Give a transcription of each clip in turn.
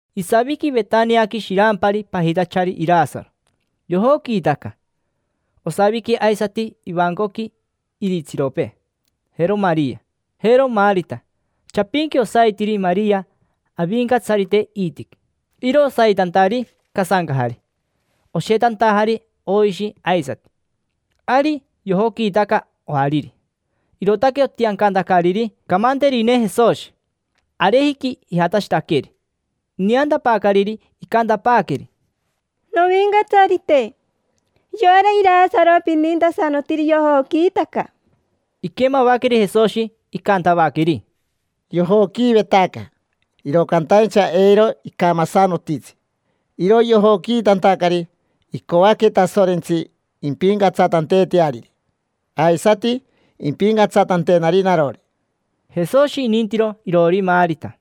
Isaviqui Vetaniaqui shirampari pajitachari Irasaro, yojoquiitaca. Osaviqui aisati ivancoqui iritsiropee: jero Maria, jero Marita. Chapinqui osaitiri Maria Avincatsarite iitiqui. Iro osaitantari casancajari. Oshetantajari oishi aisati. Ari yojoquiitaca ojariri, irootaque otiancantacariri camanterine Jesoshi. Arejiqui ijatashitaqueri. Ineantapaacariri icantapaaqueri: —Novincatsarite, yora Irasaro pinintasanotiri, yojoquiitaca. Iquemavaqueri Jesoshi, icantavaqueri: —Yojoquiivetaca, iro cantaincha eiro icamasanotitsi. Iro yojoquiitantacari, icoaque Tasorentsi impincatsatanteeteariri, aisati impincatsatanteetenari narori. Jesoshi inintiro iroori Marita,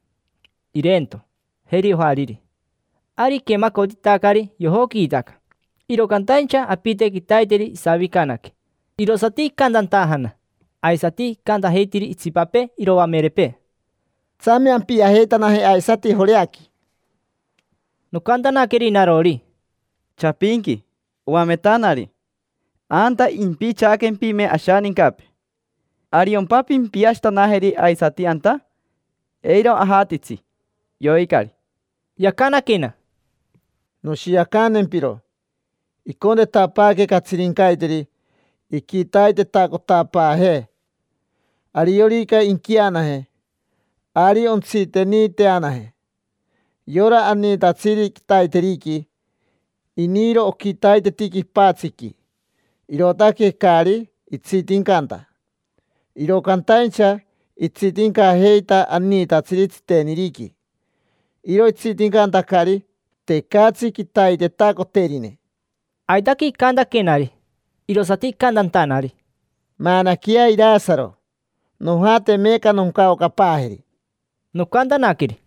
ireento, jeri ojariri. Ari iquemacotitacari yojoquiitaca, iro cantaincha apite quitaiteri isavicanaque. Irosati icantantajana aisati icantajeitiri itsipapee iroamerepee: —Tsame ampiajeitanaje aisati Joreaqui. Nocantanaqueri narori: —Chapinqui, oametanari, anta impichaaquempime ashanincapee. ¿Ariompa pimpiashitanajeri aisati anta? Eiro ajatitsi: yoicari. Yacanaquena: —Noshiacantempiro. Icontetapaaque catsirincaiteri, iquitaitetacotapaajee. Ariorica inquianaje, ari ontsiteniiteanaje. Yora aniitatsiri quitaiteriqui, iniiro oquitaiteti quipatsiqui, irootaque caari itsitincanta. Iro cantaincha itsitincajeita aniitatsiri tsiteniriqui. Iro itsitincantacari, tecatsi quitaitetacoterine. Aitaque icantaquenari. Irosati icantantanari: —Maanaqueyea Irasaro. Nojate meeca noncaocapaajeri. Nocantanaqueri: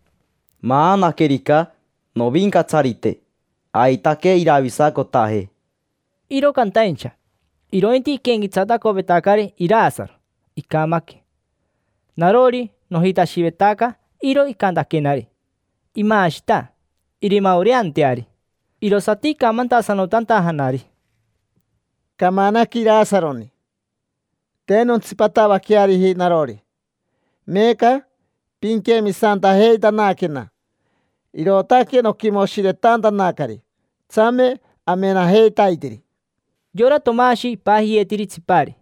—Maanaquerica, Novincatsarite, aitaque iravisacotaje. Iro cantaincha, irointi iquenquetsatacovetacari Irasaro, icamaque. Narori, nojitashivetaca iro icantaquenari: “Imaashita, irimaoreanteari”. Irosati icamantasanotantajanari: —Camanaque Irasaroni. Te nontsipatavaqueariji narori. Meeca pinquemisantajeitanaquena, irootaque noquimoshiretantanacari. Tsame amenajeitaiteri. Yora Tomashi ipajiyeetiri Tsipari,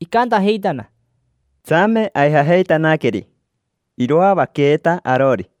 icantajeitana: —Tsame aijajeitanaqueri, iroavaqueeta arori.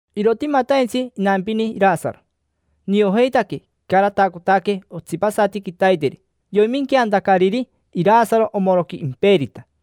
Irotimataintsi inampini Irasaro. Niojeitaque icaratacotaque otsipasati quitaiteri yoiminqueantacariri Irasaroni omoroqui imperita.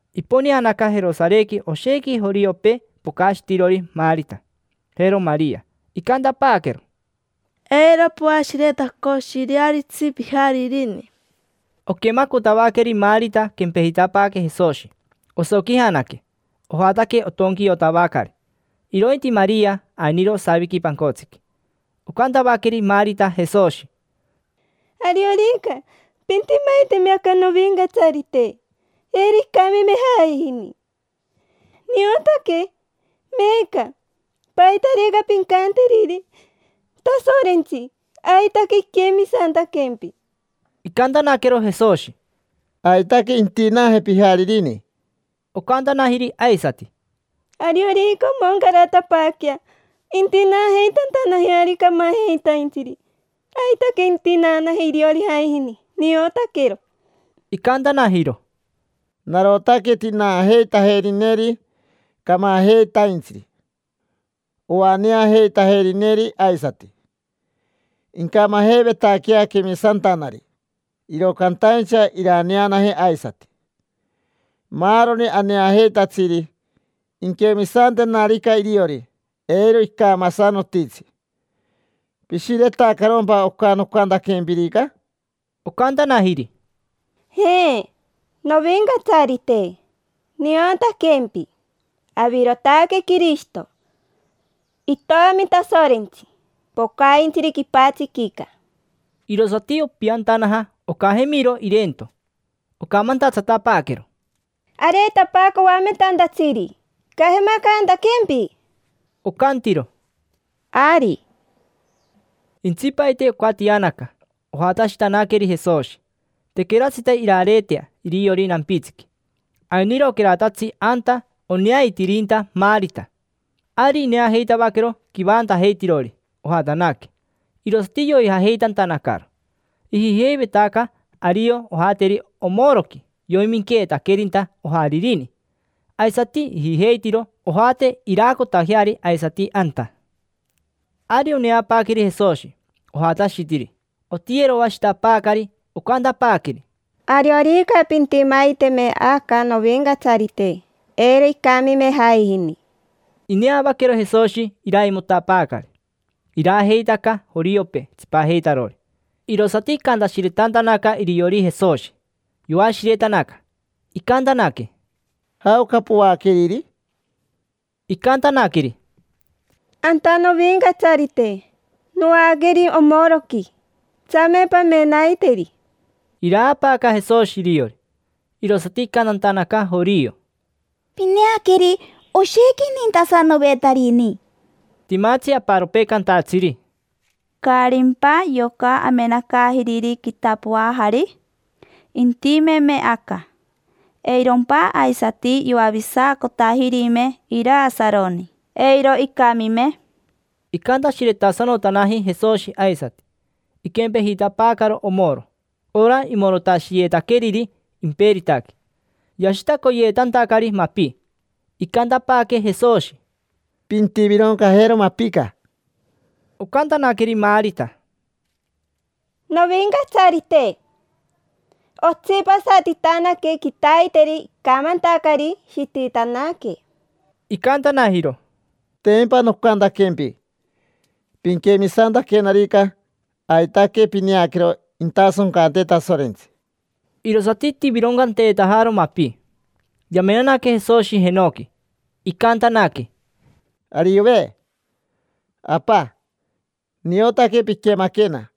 Iponeanaca Jerosarequi oshequi joriopee pocashitirori Marita, jero Maria. Icantapaaquero: —Eiro poashiretacoshirearitsi pijaririni. Oquemacotavaqueri Marita quempejitapaaque Jesoshi. Osoquijanaque, ojataque otonquiotavacari. Irointi Maria, ainiro osaviqui pancotsiqui. Ocantavaqueri Marita Jesoshi: —Ariorica pintimaiteme aca, Novincatsarite, eiro icamime jaijini. Niotaque meeca paitarica pincanteriri Tasorentsi aitaque inquemisantaquempi. Icantanaquero Jesoshi: —Aitaque intinaaje pijaririni. Ocantanajiri aisati: —Ariorica omoncaratapaaquea intinaajeitantanajeari camajeitaintsiri, aitaque intinaanaje iriori jaijini. Niotaquero. Icantanajiro: —Narotaque tinaajeitajerineri camajeitaintsiri, oaneajeitajerineri aisati. Incamajeivetaquea quemisantanari, iro cantaincha iraneanaje aisati. Maaroni aneajeitatsiri, inquemisantenarica iriori, eiro icamasanotitsi. ¿Pishiretacarompa oca nocantaquempirica? Ocantanajiri: —Je, Novincatsarite, niotaquempi, avirotaque Quirishito, Itomi Tasorentsi pocaintsiri quipatsiquica. Irosati opiantanaja ocajemiro ireento. Ocamantatsatapaaquero: —Areetapaaca Oametantatsiri, icajemacantaquempi. Ocantiro: —Ari. Intsipaite ocatianaca, ojatashitanaqueri Jesoshi. Tequeratsita irareetea iriori nampitsiqui. Ainiroqueratatsi anta oneaitirinta Marita. Ari ineajeitavaquero quivantajeitirori ojatanaque, irosati yoijajeitantanacaro. Ijijeivetaca ario ojateri omoroqui yoiminqueetaquerinta ojaririni. Aisati ijijeitiro ojate iraacotajeari aisati anta. Ari oneapaaqueri Jesoshi, ojatashitiri, otiyeroashitapaacari. Ocantapaaqueri: —Ariorica pintimaiteme aca, Novincatsarite, eiro icamime jaijini. Ineavaquero Jesoshi iraimotapaacari. Iraajeitaca joriopee tsipajeitarori. Irosati icantashiretantanacari iriori Jesoshi, yoashiretanaca. Icantanaque: —¿Jaoca poaqueriri? Icantanaqueri: —Anta, Novincatsarite, noaqueri omoroqui. Tsame pamenaiteri. Iraapaaca Jesoshi iriori. Irosati icantantanaca jorio: —Pineaqueri, oshequi inintasanovetarini. Timatsi aparopee cantatsiri: —¿Caarimpa yoca amenacaajiriri quitapoajari? Intimeme aca, ¿eirompa aisati yoavisacotajirime Irasaroni, eiro icamime? Icantashiretasanotanaji Jesoshi aisati. Iquempejitapaacaro omoro, ora imorotashiyeetaqueriri imperitaqui. Yashitacoyeetantacari mapi. Icantapaaque Jesoshi: —Pintivironcajero mapica. Ocantanaqueri Marita: —Novincatsarite, otsipasatitanaque quitaiteri icamantacari. Shititanaque. Icantanajiro: —Tempa nocantaquempi: “Pinquemisantaquenarica aitaque pineaquero intasoncante Tasorentsi”. Irosati itivironcanteetajaro mapi. Yamenanaque Jesoshi jenoqui, icantanaque: —Ariove, Apa, niotaque piquemaquena.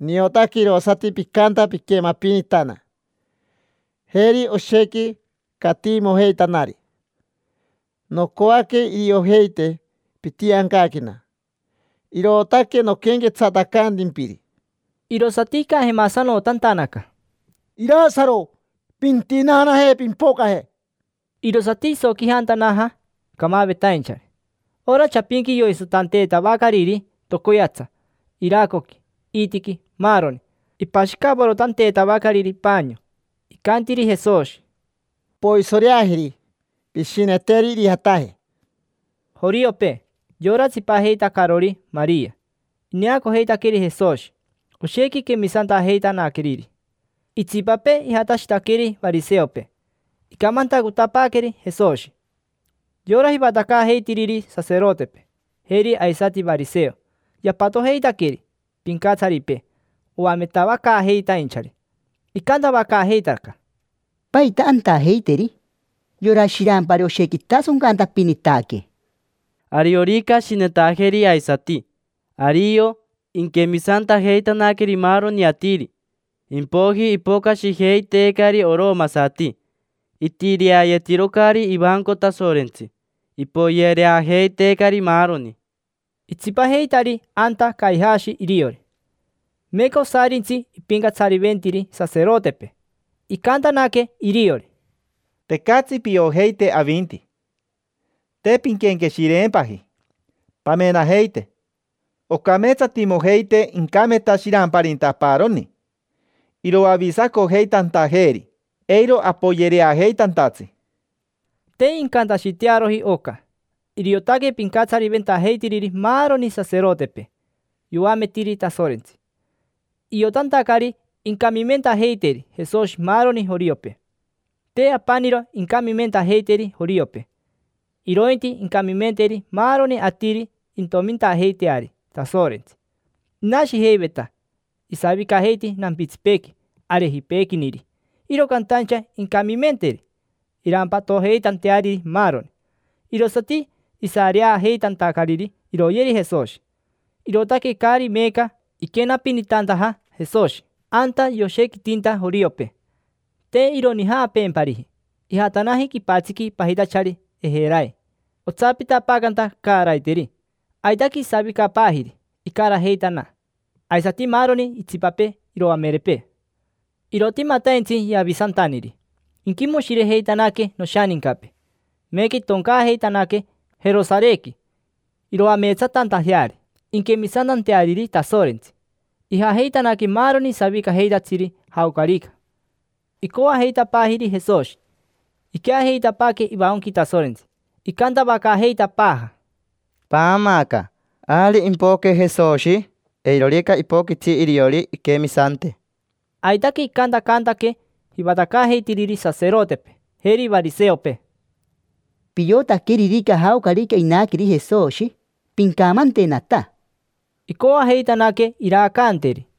Niotaque irosati picanta piquemapinitana. Jeri oshequi catiimojeitanari. Nocoaque iriojeite pitiancaquena, irootaque noquenquetsatacantimpiri. Irosati icajemasanotantanaca: —Irasaro, pintinaanaje, pimpocaje. Irosati isoquijantanaja camavetainchari. Ora chapinqui yoisotanteetavacariri tocoyatsa: iracoqui, iitiqui, maaroni. Ipashicavorotanteetavacariri paanio. Icantiri Jesoshi: —Poisoreajeri, pishineteri irijataje. Joriopee, yora tsipajeitacarori Maria, ineacojeitaqueri Jesoshi. Oshequi quemisantajeitanaqueriri; itsipapee ijatashitaqueri variseopee, icamantacotapaaqueri Jesoshi. Yora jivatacaajeitiriri saserotepee, jeri aisati variseo, yapatojeitaqueri pincatsaripee oametavacaajeitainchari. Icantavacaajeitaca: —¿Paita antajeiteri? Yora shirampari oshequi itasoncantapinitaque. Ariorica ashinetajeri aisati, ario inquemisantajeitanaqueri maaroni atiri; impoiji ipocashijeiteecari oromasati, itireayetirocari ivanco Tasorentsi. Ipoyereajeiteecari, maaroni. Itsipajeitari anta Caijashi iriori. Meeca osarintsi ipincatsariventiri saserotepee. Icantanaque iriori: —Tecatsi piojeite avinti. Te pinquenqueshireempaji. Pamenajeite: ocameetsatimojeitee incameta shiramparinta aparoni, iroavisacojeitantajeeri eiro apoyereajeitantatsi. Te incantashitearoji oca. Iriotaque pincatsariventajeitiriri maaroni saserotepee. Yoametiri Tasorentsi, iotantacari incamimentajeiteri Jesoshi maaroni joriopee. Te apaniro incamimentajeiteri joriopee, irointi incamimenteri maaroni atiri intomintajeiteari Tasorentsi. Inashijeiveta, isavicajeiti nampitsipeequi arejipeequiniri, iro cantaincha incamimenteri irampatojeitanteariri maaroni. Irosati isareajeitantacariri iroyeri Jesoshi. Irootaque caari meeca iquenapinitantaja Jesoshi anta yoshequitinta joriopee, te ironijaapeempariji. Ijatanaji quipatsiqui pajitachari Ejerai, otsapitapaacanta caaraiteri. Aitaque isavicapaajiri, icarajeitana, aisati maaroni itsipapee iroamerepee. Irotimataintsi Yavisantaniri, inquimoshirejeitanaque noshanincapee. Meeca itoncaajeitanaque Jerosarequi iroameetsatantajeari, inquemisantanteariri Tasorentsi. Ijajeitanaque maaroni savicajeitatsiri jaocarica, icoajeitapaajiri Jesoshi. Iqueajeitapaaque ivancoqui Tasorentsi, icantavacaajeitapaaja: —Paamaaca, ¿ari impoque Jesoshi? Eirorica ipoquitsi iriori inquemisante. Aitaque icantacantaque jivatacaajeitiriri saserotepee, jeri variseopee: —Piotaqueririca jaocarica inaqueri Jesoshi, pincamantenata. Icoajeitanaque iraacanteri.